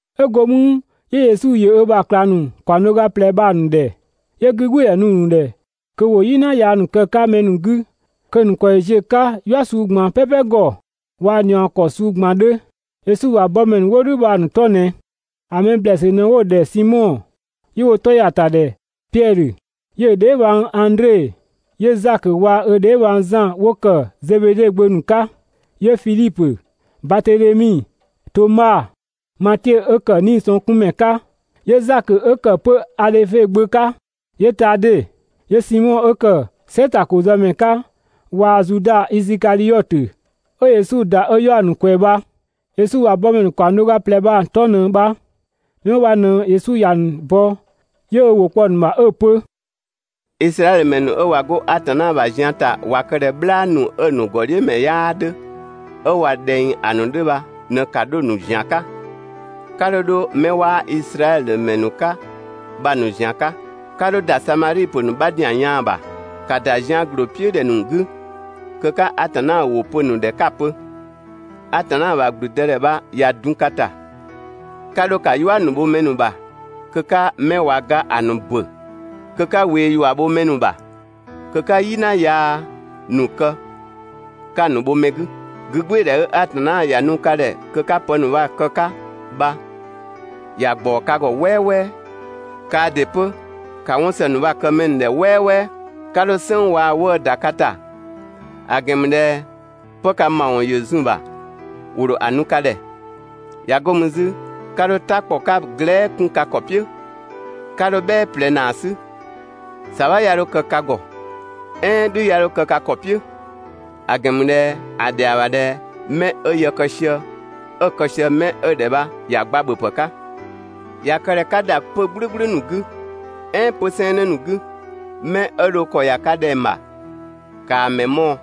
'Ö go mü 'yö Yesu ‑yö ö ‑bha ꞊klang ‑nu ‑kaɔng do ga ꞊plɛ bha‑ ‑nu ‑dhɛ, 'yö 'gügbɩɩdhɛ ‑nu ‑nu ‑dhɛ kö ‑wo "yina yaa ‑nu kë‑ 'ka mɛ ‑nu 'gü, kö‑ ‑nu ‑kɔ ‑yö ziö‑ 'ka "yua suu ꞊gban "pɛpɛ ‑gɔ, waa‑ ꞊niɔɔ ‑kɔ suu ꞊gban 'dhö. Yesu ‑bha bɔmɛ ‑nu 'wo "dhʋ̈ bha‑ ‑nu 'tɔ ꞊nɛ: ‑A mɛ ‑blɛɛsü ꞊nɛ 'wo‑ ‑dhɛ Simɔ 'yö 'wo‑ ‑tɔ ‑ya ‑ta ‑dhɛ Piɛdhö, 'yö‑ dheebhang Andre, 'yö Zakö waa‑ ö dheebhang Zan 'wo kë Zebede gbö ‑nu 'ka. 'Yö Fidhipö, Batedhemi, Toma, Matiö 'ö ‑kë 'niisɔngkunmɛ 'ka, 'yö Zakö 'ö ‑kë 'pö Adhöfe gbö 'ka, 'yö Tade, 'yö Simɔ 'ö ‑kë "sɛtakozëmɛ 'ka waa‑ Zuda Isikadhiɔtö 'ö Yesu ‑da ö 'yaɔ‑ ‑nu ꞊kwɛɛ‑ bha. Yesu ‑bha bɔmɛ ‑nu ‑kaɔng do ga ꞊plɛ bha‑ ‑nu 'tɔ ꞊në bha: 'Mɛ 'wo bha ꞊në Yesu ‑ya ‑nu bɔ 'yö ö ‑wʋ kpɔ‑ ‑nu ‑bha 'ö‑ pö: Izraɛdhö ‑mɛ ‑nu 'ö ꞊wa 'go Atanna ‑bha zian ‑ta ꞊wa kë ꞊dhɛ "bhlaa ‑nu 'ö‑ ‑nu ‑gɔdhiʋ̈mɛ 'yaa 'dhö, 'ö ꞊wa ꞊dhɛng ‑a ‑nu 'dhö bha ꞊në ‑ka 'dho‑ ‑nu ‑zian 'ka, 'ka 'dho 'dho 'mɛ 'waa Izraɛdhö ‑mɛ ‑nu 'ka bha‑ ‑nu ‑zian 'ka, 'ka 'dho ‑da Samadhi ‑pö ‑nu 'bha ‑zian yaan‑ ‑bha. ‑Ka ‑da zian ‑gloo "piʋ̈ ‑dhɛ ‑nu 'gü kö 'ka Atanna ‑wʋ pö‑ ‑nu ‑dhɛ 'ka‑ pö: «Atanna ‑bha ‑gblüdëdhɛ bha ꞊ya dun ka ‑ta! 'Ka 'dho ‑ka "yua ‑nu bho mɛ ‑nu ‑bha kö 'ka 'mɛ ꞊wa ga ‑a ‑nu ‑bö kö 'ka ꞊wee ‑yua bho mɛ ‑nu ‑bha, kö 'ka "yina yaa ‑nu kë 'ka‑ ‑nu bho mɛ 'gü! 'Gügbɩɩdhɛ 'ö Atanna ‑ya nu ka ‑dhɛ kö 'ka pë ‑nu bha‑ ‑nu kë‑ 'ka bha ‑ya ‑gbaɔ ka ‑gɔ "wɛɛwɛɛ. Kaa ‑dɩ 'pö, ‑ka 'wɔn ‑së ‑nu bha‑ kë mɛ ‑nu ‑dhɛ "wɛɛwɛɛ. 'Ka dho "sënng waa‑ 'wëë‑ ‑da ka ‑ta (‑a ‑gɛn ‑mü ꞊dhɛ 'pë ka ‑mawɔn ‑yö zun‑ ‑bha ‑wo ‑dho ‑a nu ka ‑dhɛ). ꞊Ya 'go mü 'zü, 'ka 'dho "ta ‑kpɔ 'ka glɛɛ" 'kun ka ‑kɔ "piʋ̈, 'ka 'dho "bhɛɛ ꞊plɛ ‑naa 'sü, ‑sabha 'ya 'dho kë ka ‑gɔ, "ɛɛn "dhü 'ya 'dho kë ka ‑kɔ "piʋ̈! ‑A ‑gɛn ‑mü ꞊dhɛ ‑a ‑dhɛa ‑bha ꞊dhɛ 'mɛ 'ö yë kë sië, 'ö‑ kë sië 'mɛ 'ö‑ ‑dhɛ bha ‑ya gba ‑bhöpë 'ka. ꞊Ya kë ꞊dhɛ 'ka ‑da 'pö‑ "gblʋ̈gblʋ̈ ‑nu 'gü, "ɛɛn 'pö‑ 'sɛɛnnë ‑nu 'gü, 'mɛ 'ö dho ‑kɔ ‑ya ka ‑dhɛng ‑bha, ‑kaa mɛ mɔɔ‑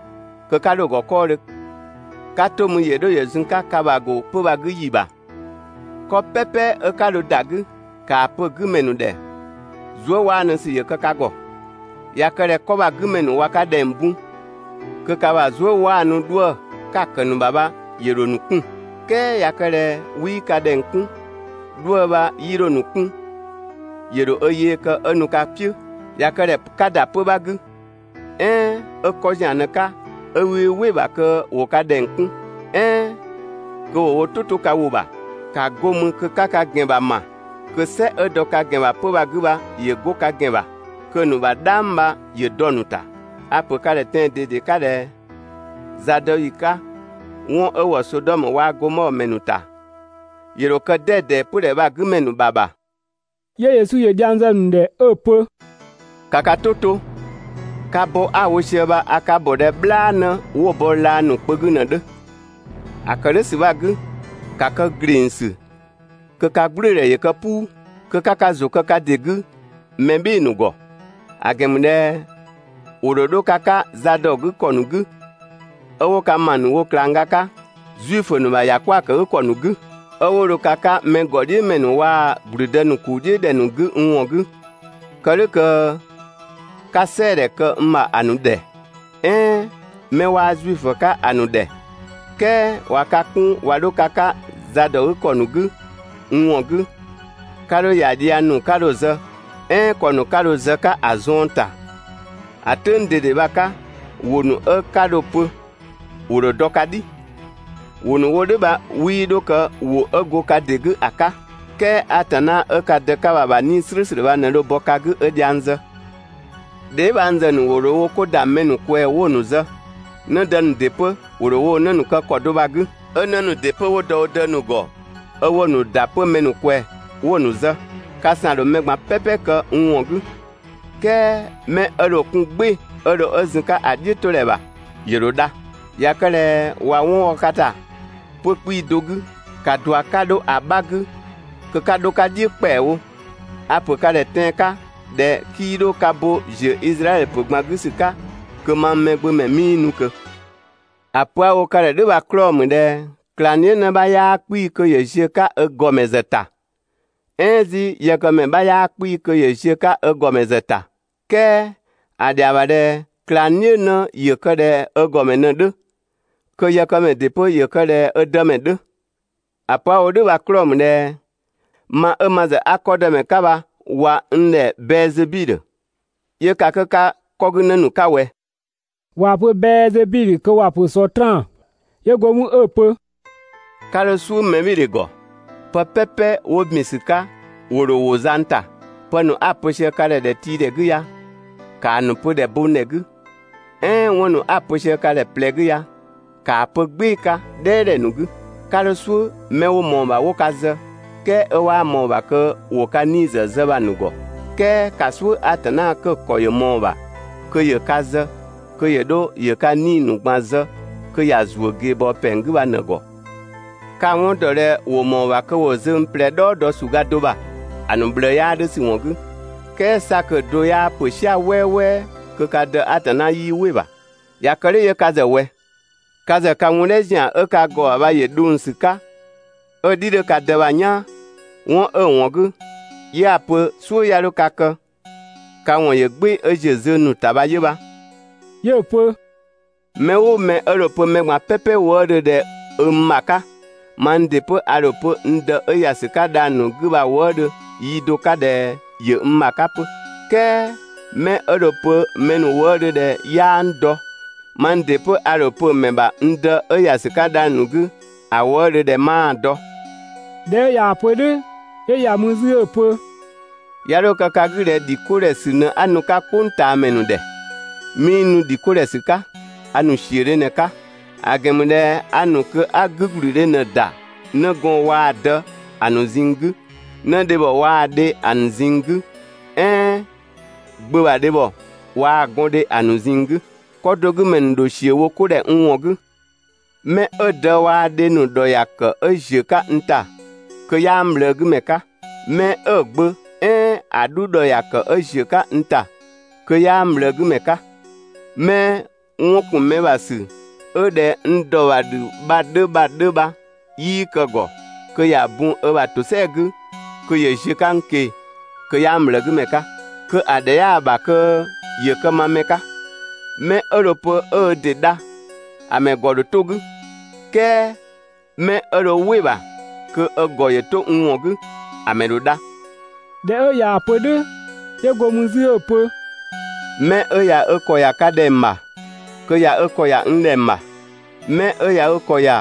kö 'ka 'dho‑ ‑gɔ 'kɔɔdhö 'ka 'to mü ‑yö 'dho ‑yö zun‑ 'ka ka ‑bha ‑go 'pö‑ bha‑ 'gü ‑yi ‑bha. 'Kɔ "pɛpɛ 'ö 'ka dho ‑da 'gü, ‑kaa pö‑ 'gü ‑mɛ ‑nu ‑dhɛ: «Zuëwaanusü ‑yö kë ka ‑gɔ! ꞊Ya kë ꞊dhɛ 'kɔ bha‑ 'gü ‑mɛ ‑nu ꞊wa ka ‑dhɛng bun, kö ka ‑bha zuëwaanu 'dhuë‑ 'ka‑ ‑kë ‑nu ‑bha bha ‑yö ‑dho ‑nu 'kun‑. "Kɛɛ ꞊ya kë ꞊dhɛ 'wii ka ‑dhɛng 'kun, 'dhuë‑ bha 'yii 'dho‑ ‑nu 'kun‑ ‑yö ‑dho ö yee kë 'ö nu ka "piʋ̈. ꞊Ya kë ꞊dhɛ 'ka ‑da 'pö‑ 'bha 'gü, "ɛɛn 'ö 'kɔ ‑zian ꞊në‑ 'ka 'ö 'wii "wɩ‑ ‑bha kö ‑wo ka ‑dhɛng 'kun, "ɛɛn kö ‑wo wo "tʋ ‑to ka ‑wʋ ‑bha, ‑ka 'go mü kö 'ka ka ‑gɛn ‑bha ‑ma kö "sɛ 'ö dɔ ka ‑gɛn ‑bha 'pö‑ bha‑ 'gü bha ‑yö 'go ka ‑gɛn ‑bha (kö‑ ‑nu ‑bha "dhang bha ‑yö dɔ‑ ‑nu ‑ta). A‑ ‑pö ka ‑dhɛ tɛan‑ ꞊dede 'ka ꞊dhɛ: Zadɔyi 'ka 'wɔn 'ö ‑wɔ Sodɔmö waa‑ Gomɔɔ ‑mɛ ‑nu ‑ta, ‑yö ‑dho kë 'dɛdɛ 'pödhɛ bha‑ 'gü ‑mɛ ‑nu ‑bha ‑bha.» 'Yö Yesu ‑yö dhiang zë‑ ‑nu ‑dhɛ 'ö‑ pö: «‑Ka ka "tʋ 'to! Ka bɔ 'a‑ wo sië bha a ka ‑bɔ ꞊dhɛ "bhlaanë 'wo‑ bɔ laa ‑nu kpö 'gü ꞊në‑ 'dhö. ‑A ‑kë "dhʋ̈ ‑sü bha‑ 'gü, ‑ka kë ‑glengsü kö ka "gblʋ̈ʋ̈dhɛ ‑yö kë "puu! Kö 'ka ka ‑zʋ kë ka ‑dɩ 'gü mɛ "bhɩɩ‑ ‑nu ‑gɔ, ‑a ‑gɛn ‑mü ꞊dhɛ ‑wo ‑dho 'dho ka 'ka zadɔgükɔ ‑nu 'gü, 'ö 'wo ka ‑ma ‑nu wo ꞊klangga 'ka Zuifö ‑nu ‑bha ‑yakwëëkëgükɔ ‑nu 'gü. 'Ö 'wo dho ka 'ka mɛ ‑gɔdhiʋ̈mɛ ‑nu waa‑ ‑gblüdë ‑nu ‑kuu "dhiʋ̈ ‑dhɛ ‑nu 'gü n ‑wɔn 'gü kë "dhʋ̈ kö 'ka "sɛɛdhɛ kë n ‑bha ‑a ‑nu ‑dhɛ, "ɛɛn 'mɛ 'waa Zuifö 'ka ‑a ‑nu ‑dhɛ. "Kɛɛ ꞊wa ka 'kun ꞊wa 'dho ka 'ka zadɔgükɔ ‑nu 'gü (n ‑wɔn 'gü), 'ka 'dho ‑ya dhiang ‑nu 'ka dho‑ zë, "ɛɛn ‑kɔ ‑nu 'ka dho‑ zë‑ 'ka ‑a zuën ‑ta. ‑A "tʋ̈ng ꞊dede bha‑ 'ka, ‑wʋ ‑nu 'ö 'ka dho‑ pö ‑wo ‑dho dɔ ka "dhi. ‑Wʋ ‑nu 'wo "dhʋ̈ bha 'wii 'dho kë ‑wʋ 'ö go ka ‑dɩ 'gü ‑a 'ka, "kɛɛ Atanna 'ö ka Dë 'ka bha‑ ‑bha 'Nii‑ "slʋ̈ʋ̈slʋ̈ bha ꞊në dho bɔ ka 'gü 'ö dhiang zë. Dheebhangzë ‑nu ‑dho wo 'ko ‑da mɛ ‑nu ꞊kwɛɛ 'wo‑ ‑nu zë. 'Në dë ‑nu ‑dɩ 'pö ‑wo ‑dho woo‑ 'në ‑nu kë ‑kɔ do bha‑ 'gü. 'Ö 'në ‑nu ‑dɩ 'pö 'wo dɔ wo dë ‑nu ‑gɔ, 'ö 'wo‑ ‑nu ‑da 'pö mɛ ꞊kwɛɛ‑ 'wo‑ ‑nu zë. Ka ‑san ‑dho mɛ ꞊gban "pɛpɛ kë n ‑wɔn 'gü, "kɛɛ 'mɛ 'ö dho‑ 'kun "gbɩɩ‑ 'ö dho 'ö zun‑ 'ka ‑a "dhiʋ̈todhɛ ‑bha, ‑yö ‑dho dha. ꞊Ya kë ꞊dhɛ ꞊wa 'wɔn wɔ ka ‑ta 'pö‑ 'kpii‑ do 'gü, ‑ka ꞊dua 'ka 'dho ‑a 'bha 'gü kö 'ka 'dho‑ 'ka "dhiʋ̈ ‑kpɛawo! A‑ ‑pö ka ‑dhɛ tɛan‑ 'ka ꞊dhɛ 'kii 'dho ka bo ‑ziö Izraɛdhö ‑pö ꞊gban 'gü ‑sü 'ka kö mang Mɛgbömɛ 'mii nu ꞊kö. ‑A pö 'a‑ wo ka ‑dhɛ "dhʋ̈ bha‑ 'klɔɔ‑ ‑mü ꞊dhɛ ꞊klangdhiʋ̈ 'në 'bha 'yaa 'kpii‑ kö ‑yö ziö‑ 'ka ö ‑gɔmɛ ‑zë ‑ta, "ɛɛn 'zü yëkëmɛ 'bha 'yaa 'kpii‑ kö ‑yö ziö‑ 'ka ö ‑gɔmɛ ‑zë ‑ta. "Kɛɛ ‑a ‑dhɛa ‑bha ꞊dhɛ ꞊klangdhiʋ̈ 'në ‑yö kë ꞊dhɛ ö ‑gɔmɛ ꞊në‑ 'dhö, kö yëkëmɛ ‑dɩ 'pö ‑yö kë ꞊dhɛ ö dëmɛ 'dhö. ‑A pö 'a‑ wo "dhʋ̈ bha‑ 'klɔɔ‑ ‑mü ꞊dhɛ ma 'ö ma ‑zë 'a 'kɔ dëmɛ 'ka bha ꞊wa n ‑dhɛ Bɛɛzebidhö, 'yö ka 'kö 'ka 'kɔgünë ‑nu 'ka ꞊wɛ? (꞊Waa‑ pö Bɛɛzebidhö kö ‑wa ‑pö Sɔtraan.) 'Yö go mü 'ö‑ pö: «'Ka 'dho "suʋ̈ mɛbhɩɩdhe ‑gɔ! Pë "pɛpɛ 'wo ‑bin ‑sü 'ka ‑wo ‑dho ‑wo zang ‑ta. Pë ‑nu 'a‑ pö sië ka ‑dhɛ ‑dhɛtiidhɛ 'gü ya, ‑kaa ‑nu pö ‑dhɛbongdhɛ 'gü, "ɛɛn 'wɔn ‑nu 'a‑ pö sië ka ‑dhɛ ꞊plɛ 'gü ya, ‑kaa pö "gbɩɩ‑ 'ka "dhɛɛdhɛ ‑nu 'gü! 'Ka 'dho "suʋ̈ 'mɛ 'wo ꞊mɔɔ‑ ‑bha 'wo ka zë, "kɛɛ 'ö 'waa ꞊mɔɔ‑ ‑bha kö ‑wo ka 'nii‑ ‑zë zë bha‑ ‑nu ‑gɔ! "Kɛɛ ‑ka "suʋ̈ Atanna 'kö‑ ‑kɔ ‑yö ꞊mɔɔ‑ ‑bha kö ‑yö ka zë kö ‑yö 'dho ‑yö ka 'nii‑ ‑nu ꞊gban zë kö ‑ya ‑zuö ꞊geebɔɔ pɛng 'gü bha ꞊në‑ ‑gɔ! Ka‑ 'wɔn ‑dɔ ꞊dhɛ ‑wo ‑mɔɔ ‑bha kö ‑wo zöng ꞊plɛ "dhɔɔ dɔ ‑suga do ‑bha, (‑a ‑nu ꞊bhlëë 'yaa 'dhö ‑sü ‑wɔn 'gü), "kɛɛ 'sa kö‑ do 'yaa ‑pö "sia‑ "wɛɛwɛɛ kö ka Dë Atanna 'yii "wɩ‑ ‑bha. ꞊Ya kë "dhʋ̈ 'yö ka ‑zë ꞊wɛ? Ka ‑zë ka wun "dhɛ ‑zian 'ö ka ‑gɔ ‑bha bha ‑yö dhong ‑sü 'ka 'ö‑ "dhi 'dhö ka dë bha‑ "yaan. 'Wɔn 'ö‑ ‑wɔn 'gü, 'yö 'a‑ pö "suʋ̈ 'ya 'dho ka kë, ka ‑wɔn ‑yö "gbɩɩ‑ 'ö ziö zöng ‑nu ‑ta bha 'yö bha.» 'Yö‑ pö: «Mɛ "ʋʋ mɛ 'ö dho‑ pö mɛ ꞊gban "pɛpɛ wëëdhö ꞊dhɛ 'ö n ‑bha 'ka, mang ‑dɩ 'pö a ‑dho pö n Dë 'ö ‑ya ‑sü 'ka dhang‑ ‑nu 'gü bha‑ wëëdhö (yi do 'ka) ꞊dhɛ ‑yö n ‑bha 'ka 'pö. "Kɛɛ 'mɛ 'ö dho‑ pö mɛ ‑nu wëëdhö ꞊dhɛ 'yaa n dɔ, mang ‑dɩ 'pö a ‑dho pö‑ ‑mɛ ‑bha n Dë 'ö ‑ya ‑sü 'ka dhang‑ ‑nu 'gü, ‑a wëëdhö ꞊dhɛ 'maa‑ dɔ.» ꞊Dhɛ 'ö ꞊yaa‑ pö "dhʋ̈, 'yö ‑ya mü 'zü 'ö‑ pö: «'Ya 'dho kë ka 'gü ꞊dhɛ ‑dhi 'ko ‑dhɛ ‑sü ꞊në 'a nu‑ 'ka "kpʋngtaamɛ ‑nu ‑dhɛ. 'Mii nu ‑dhi 'ko ‑dhɛ ‑sü 'ka, a ‑nu ‑siödhe ꞊në‑ 'ka. ‑A ‑gɛn ‑mü ꞊dhɛ a ‑nu kö 'a 'gügblüdhe ꞊në‑ ‑da 'nëgɔɔn waa‑ dë ‑a ‑nu ꞊zinng 'gü, 'nëdhebhɔ waa‑ dhe ‑a ‑nu ꞊zinng 'gü, "ɛɛn gbö ‑bha dhebhɔ waa‑ gɔndhe ‑a ‑nu ꞊zinng 'gü. 'Kɔ do 'gü ‑mɛ ‑nu ‑dho ‑siö wo 'ko ‑dhɛ n ‑wɔn 'gü. 'Mɛ 'ö‑ dë waa‑ dhe ‑nu ‑dhɔ dho‑ kë kö ‑yö ziö‑ 'ka n ‑ta, kö 'yaa n ꞊bhlëëgümɛ 'ka; 'mɛ 'ö‑ gbö "ɛɛn ‑a 'dhu ‑dhɔ ‑ya ‑kë 'ö ‑ziö 'ka n ‑ta kö 'yaa n ꞊bhlëëgümɛ 'ka. 'Mɛ 'wɔn ‑kun mɛ ‑bha ‑sü 'ö ꞊dhɛ n ‑dɔ ‑bha "dhü bha‑ 'dhö bha 'yii kë‑ ‑gɔ kö ‑ya bun ö ‑bha ‑tosɛa 'gü kö ‑yö ziö‑ 'ka n ꞊keng‑ kö 'yaa n ꞊bhlëëgümɛ 'ka, kö ‑a ‑dhɛ 'yaa‑ ‑bha kö ‑yö kë ma mɛ 'ka. 'Mɛ 'ö dho‑ pö 'ö ö ‑dɩ dha, ‑a ‑mɛ ‑gɔ ‑dho 'to‑ 'gü, "kɛɛ 'mɛ 'ö dho "wɩ‑ ‑bha kö ö ‑gɔ 'to n ‑wɔn 'gü, ‑a ‑mɛ ‑dho dha. ꞊Dhɛ 'ö ꞊yaa‑ pö "dhʋ̈, 'yö go mü 'zü 'ö‑ pö: «'Mɛ 'ö ꞊ya 'ö ‑kɔ ‑ya ka ‑dhɛng ‑bha, kö ꞊ya ö ‑kɔ ‑ya n ‑dhɛng ‑bha. Mɛ 'ö ꞊ya ö ‑kɔ ‑ya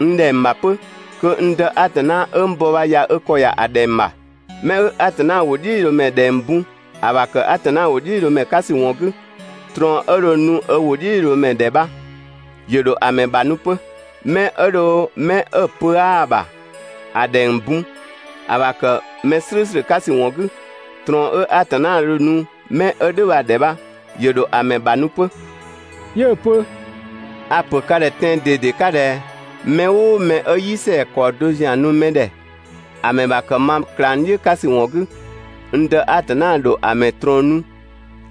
n ‑dhɛng ‑bha 'pö, kö n Dë Atanna 'ö n bɔ bha ꞊ya ö ‑kɔ ‑ya ‑a ‑dhɛng ‑bha. 'Mɛ 'ö Atanna ‑wʋdhiʋ̈loomɛ ‑dhɛng bun ‑a ‑bha ‑kë Atanna ‑wʋdhiʋ̈loomɛ 'ka ‑sü ‑wɔn 'gü, ꞊trɔɔn 'ö dho‑ ‑nu ö ‑wʋdhiʋ̈loomɛ ‑dhɛ bha, ‑yö ‑dho ‑a ‑mɛ ‑bha nu 'pö. 'Mɛ 'ö dho 'mɛ 'ö pö 'aa‑ ‑bha ‑a ‑dhɛng bun ‑a ‑bha ‑kë mɛ "slʋ̈ʋ̈slʋ̈ 'ka ‑sü ‑wɔn 'gü, ꞊trɔɔn 'ö Atanna dho‑ nu 'mɛ 'ö "dhʋ̈ bha‑ ‑dhɛ bha, ‑yö ‑dho ‑a ‑mɛ ‑bha nu 'pö. 'Yö‑ pö a‑ ‑pö ka ‑dhɛ tɛan‑ ꞊dede 'ka ꞊dhɛ: Mɛ "ʋʋ mɛ 'ö "yi ‑sɛa ‑kɔɔ do ‑zian nu mɛ ‑dhɛ, ‑a ‑mɛ ‑bha ‑kë ma ꞊klangdhiʋ̈ 'ka ‑sü ‑wɔn 'gü, n Dë Atanna ‑dho ‑a ‑mɛ ꞊trɔɔn nu,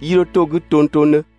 'yii 'dho 'to‑ 'gü tongtongdhö.